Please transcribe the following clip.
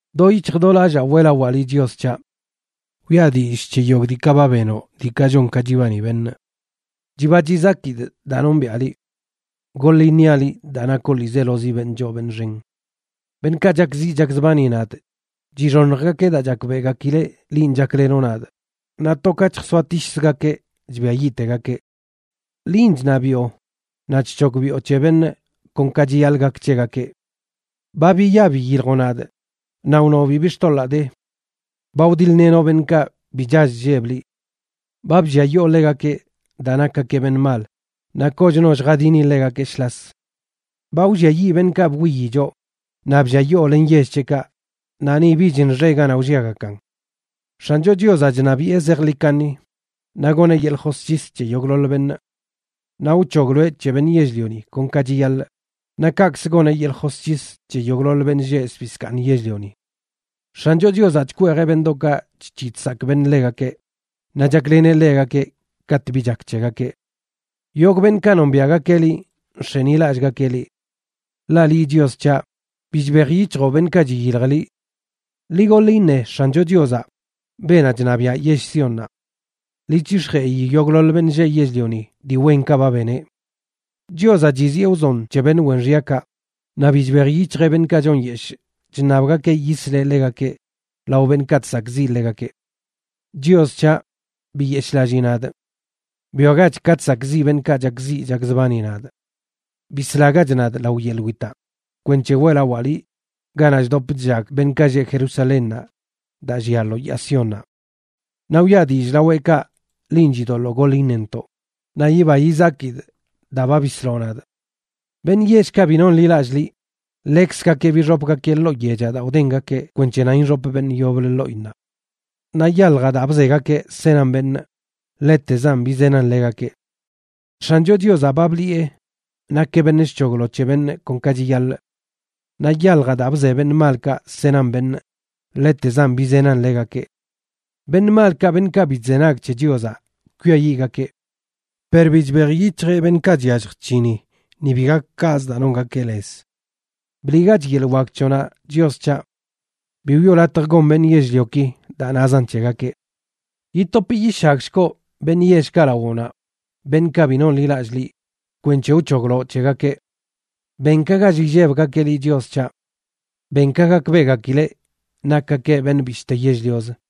Do yic̱hj do lallaa weꞌlawaa liꞌ, Chios c̱haꞌ. Wiꞌa dillꞌ c̱he yogꞌ diikaꞌ ba benoꞌ diikaꞌ chon ka chibani beṉꞌ. Chiba chizakidꞌ daa nombiꞌa liꞌ. Goḻꞌ iṉiaꞌ liꞌ daa nakoꞌ ḻiizelozi beṉꞌ choo beṉꞌ xen. Beṉꞌkaꞌ chakziꞌ chakzbani nadꞌ chixoṉjgakeꞌ daa chakbeꞌgakileꞌ linꞌ chaklenoꞌ nadꞌ, naꞌ to ka chjsoatishzgakeꞌ chbiayiꞌtegakeꞌ. Linꞌ chṉabiꞌo, naꞌ chc̱hogbiꞌo c̱he beṉꞌ kon ka chiyaḻꞌ gak c̱hegakeꞌ; ba biya biyiljoꞌ nadꞌ naꞌ wnoꞌ bibi xtoḻaa de. Ba wdiḻ-lenoꞌ beṉꞌkaꞌ bi chall chlleb liꞌ. Ba blliayoo ḻegakeꞌ daa nakgakeꞌ beṉꞌ mal, naꞌ kochno lljadini ḻegakeꞌ shlas. Ba wlliayiꞌ beṉꞌkaꞌ bwiyi choꞌ, naꞌ blliayoo len yell c̱heꞌkaꞌ, naꞌ ni bich nxe ganaꞌ wlliagakan. X̱ancho Chiozaꞌ chṉabiꞌe zejḻi kaṉi, naꞌ goneꞌ yeḻꞌ josc̱his c̱he yogꞌḻoḻ beṉꞌ. Naꞌ wc̱hogloeꞌ c̱he beṉꞌ yell-lioni kon ka chiyaḻꞌ; naꞌ kaꞌkzə goneꞌ yeḻꞌ josc̱his c̱he yogꞌḻoḻ beṉꞌ lleꞌ zbii zkaaṉ yell-lioni. X̱ancho Chiozaꞌ chkweejeꞌ beṉꞌdoꞌkaꞌ chc̱hiꞌ chsakꞌ beṉꞌ ḻegakeꞌ, naꞌ chakleneꞌ ḻegakeꞌ katꞌ bi chak c̱hegakeꞌ. Yogꞌ beṉꞌkaꞌ nombiaꞌgakeꞌ liꞌ nx̱enilallꞌgakeꞌ liꞌ. Ḻaꞌ liꞌ, Chios c̱haꞌ, bi chbejyic̱hjoꞌ beṉꞌkaꞌ chiyilj liꞌ. Ḻi goḻ iṉe X̱ancho Chiozaꞌ, beenaꞌ chṉabiaꞌ yell Siónnaꞌ. Ḻi c̱hix̱jeꞌi yogꞌḻoḻ beṉꞌ lleꞌ yell-lioni dii wenkaꞌ ba beneꞌ. Chiozaꞌ chiziꞌe wzon c̱he beṉꞌ wen xyakaꞌ, naꞌ bi chbej yic̱hjeꞌ beṉꞌkaꞌ chonyeshꞌ chṉabgakeꞌ yisleꞌ ḻegakeꞌ lao beṉꞌkaꞌ chsakꞌziꞌ ḻegakeꞌ. Chios c̱haꞌ, biyeshꞌlallii nadꞌ. Bwiagach ka chsakꞌziꞌ beṉꞌkaꞌ chakziꞌ chakzbani nadꞌ. ¡Bislagach nadꞌ lao yeḻꞌ witaꞌ!, kwenc̱he weꞌlawaa liꞌ ganaꞌ chdop chllag beṉꞌkaꞌ lleꞌ Jerusalénnaꞌ, daa llia lo yaa Siónnaꞌ. Naꞌ wiꞌa dillꞌ laweꞌkaꞌ linꞌ chidoḻoo goḻ iṉentoꞌ, naꞌ yiba yizakidꞌ daa ba bisloꞌ nadꞌ. Beṉꞌ yellkaꞌ bi nonḻilallꞌ liꞌ, ḻekzgakeꞌ bixopgakeꞌ ḻoo yechaꞌ daa wdengakeꞌ kwenc̱he nan ixop beṉꞌ yoblə ḻoꞌinnaꞌ. Naꞌ yaljaꞌ daa bzegakeꞌ senan beṉꞌ, ḻetezan bizenan ḻegakeꞌ. X̱ancho Chiozaꞌ ba bliꞌe nakeꞌ beṉꞌ chc̱hoglo c̱he beṉꞌ kon ka chiyaḻꞌ. Naꞌ yaljaꞌ daa bze beṉꞌ malkaꞌ senan beṉꞌ, ḻetezan bizenan ḻegakeꞌ. Beṉꞌ malkaꞌ, beṉꞌkaꞌ bi chzenag c̱he Chiozaꞌ, kwiayiꞌgakeꞌ. Per bi chbej yic̱hjeꞌ beṉꞌkaꞌ chyallj chc̱hini, ni bi gak kaꞌzə daa nongakeꞌ lez. ¡Bliꞌgach yeḻꞌ wak c̱hoꞌnaꞌ, Chios c̱haꞌ! Bi wiꞌo latj gon beṉꞌ yell-lioki daa nazan c̱hegakeꞌ. Yitop yishagshgoꞌ beṉꞌ yellkaꞌ lawoꞌnaꞌ, beṉꞌkaꞌ bi nonḻilallꞌ liꞌ, kwenc̱he wc̱hogloꞌ c̱hegakeꞌ. Ben ka gall illebgakeꞌ liꞌ, Chios c̱haꞌ. Ben ka gakbeꞌgakileꞌ nakgakeꞌ beṉꞌ bishte yell-liozə.